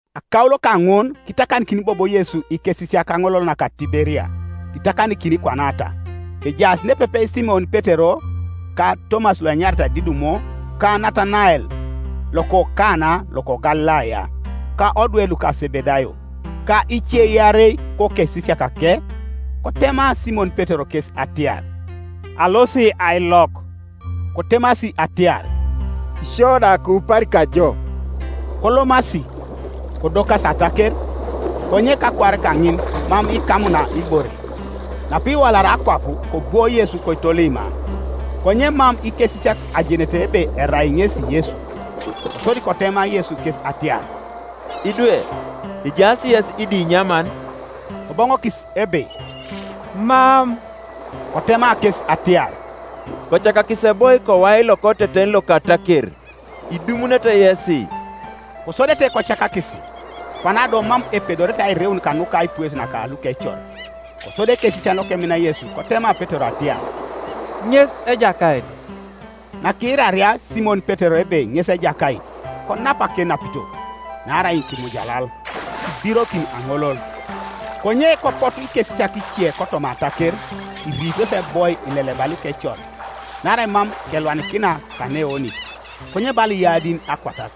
Akaulo kaŋun kitakanikin bobo Yesu ikesisiak kaŋolol naka Tiberia; kitakanikin kwanata: kejaas nepepe Simon Petero, ka Tomas loenyaritai Didumo, ka Natanael, loko Kana loko Galilaya, ka odwe luka Sebedayo, ka ice iarei kokesisiakake. Kotema Simon Petero kes atiar, “Alosi ailok.” Kotemasi atiar, “Isio da kiupari kajo.” Kolomasi, kodokasi ataker; konye kakuar kaŋin mam ikamuna ibore. Napiwalari akwap kobwo Yesu koitolima; konye mam ikesisiak ajenete ebe erai ŋesi Yesu. Kosodi kotema Yesu kes atiar, “Idwe, ejaas yes idinyaman?” Koboŋokis ebe, “Mam.” Kotema kes atiar, “Kocakakisi eboi kowai lokoteten loka ataker, idumunete yesi.” Kosodete kocakakis, kwana do mam epedorete airiun kanuka aipues naka lukecor. Kosodi ekesisian lokemina Yesu kotema Petero atiar, “Ŋes Ejakait.” Nakiiraria Simon Petero ebe ŋes Ejakait, konap akenapito (naarai kimujalal), kibirokin aŋolol, Konye kopotu ikesisiak ice kotoma ataker, iriitos eboi ileleba lukecor, naarai mam kelwanikina kaneeoŋit, konye bala iyadin akwatat.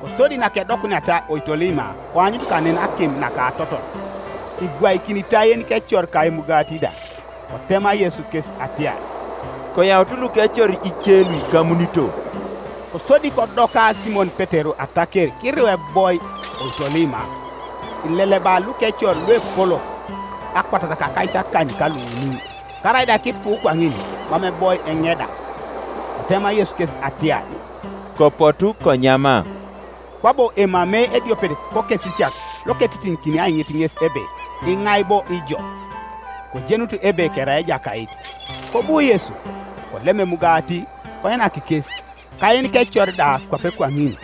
Kosodi nakedokuniata oitolima koanyut kanen akim naka atotol, ibwaikinitai yenikecor ka emugati da. Kotema Yesu kes atiar, “Koyaut lukecor ice luikamunito.” Kosodi kodoka Simon Petero ataker kiriu eboi oitolima, ileleba lukecor luepolok, akwatat ka akaisakany ka luuni: karaida kipu kwaŋin, mam eboi eŋeda, Kotema Yesu kes atiar, “Kopotu konyama.” Kwabo emamei ediopet kokesisiak loketitiŋikini aiŋit ŋes ebe, “Iŋai bo ijo?” Kojenut ebe kerai Ejakait. Kobu Yesu, kolem emugati koinak kes, ka yenikecor da kwape kwaŋin.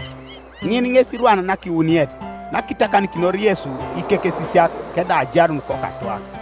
Ŋin ŋes irwan nakiwuniet nakitakanikinor Yesu ikekesisiak kedau ajarun kokatwak.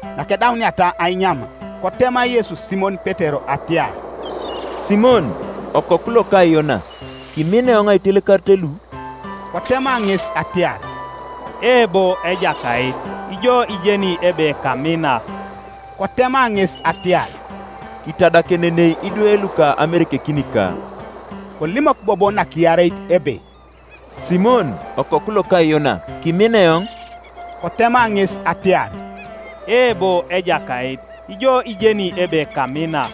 Nakedauniata ainyam, kotema Yesu Simon Petero atiar, “Simon, okoku loka Yona, kimina eoŋ aitelekarit lu?” Kotema ŋes atiar, “Eebo, Ejakait, ijo ijeni ebe kamina.” Kotema ŋes atiar, “Kitadakenenei idwe luka amerekekinika.” Kolimok bobo nakiareit ebe, “Simon, okoku loka Yona, kimina eoŋ?” Kotema ŋes atiar, “Eebo, Ejakait, ijo ijeni ebe kamina,”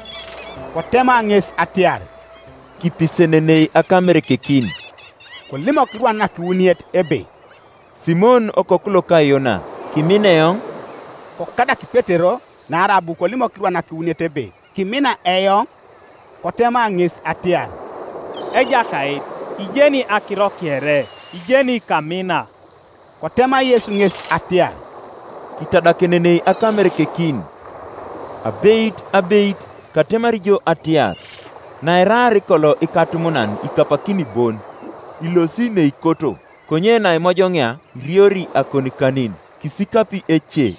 Kotema ŋes atiar, “Kipisenenei akamerekekin.” Kolimok irwan nakiwuniet ebe, “Simon okoku loka Yona, kimina eoŋ?” Kokadak Petero naarai abu kolimok irwan nakiwuniet ebe, “Kimina eoŋ?” Kotema ŋes atiar, “Ejakait, ijeni akiro kere; ijeni kamina.” Kotema Yesu ŋes atiar, “Kitadakenenei akamerekekin. Abeit, abeit, katemari jo atiar, Nairaar kolo ikatumunan ikapakini bon, ilosi neikoto: konye naimojoŋia iriori akonikanin, kisikapi ece,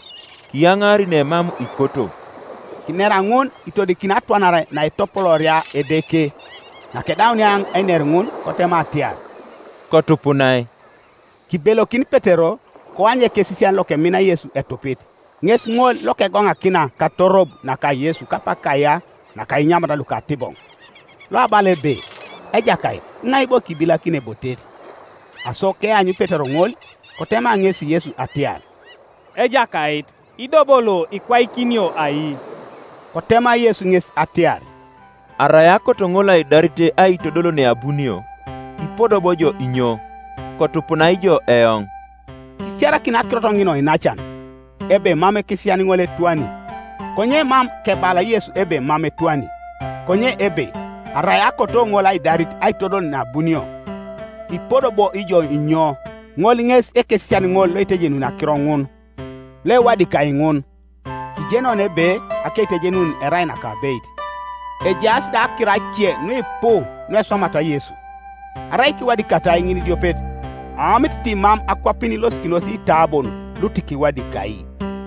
kiyaŋaari nemam ikoto.” Kinera ŋun itodikini atwanare naetopolooria Edeke. Nakedaunia einer ŋun, kotema atiar, “Kotupunai.” Kibelokin Petero, koany ekesisian lokemina Yesu etupit, ŋes ŋol lokegoŋakina katorob naka Yesu kapak kaya naka inyamat lukatiboŋ, loabala ebe, “Ejakait, iŋai bo kibilakini ebotet?” Aso keanyu Petero ŋol, kotema ŋesi Yesu atiar, “Ejakait, ido bo lo ikwaikinio ai?” Kotema Yesu ŋes atiar, “Arai akoto ŋol aidarit aitodol neabunio, ipodo bo ijo inyo? Kotupunai ijo eoŋ.” Kisiarakin akirot ŋin oinacan, ebe mam ekesisian ŋol etwani, konye mam kebala Yesu ebe mam etwani; konye ebe, “Arai akoto ŋol aidarit aitodol neabunio, ipodo bo ijo inyo?” Ŋol ŋes ekesisian ŋol loitejenuni akiro ŋun, loewadikai ŋun; kijeni oni ebe akeitejenun erai nakabeit. Ejaas da akiro ace nuipu nueswamat Yesu, arai kiwadikatai ŋinidiopet, aomit ti mam akwapin ilosikinos iitabon lutikiwadikai.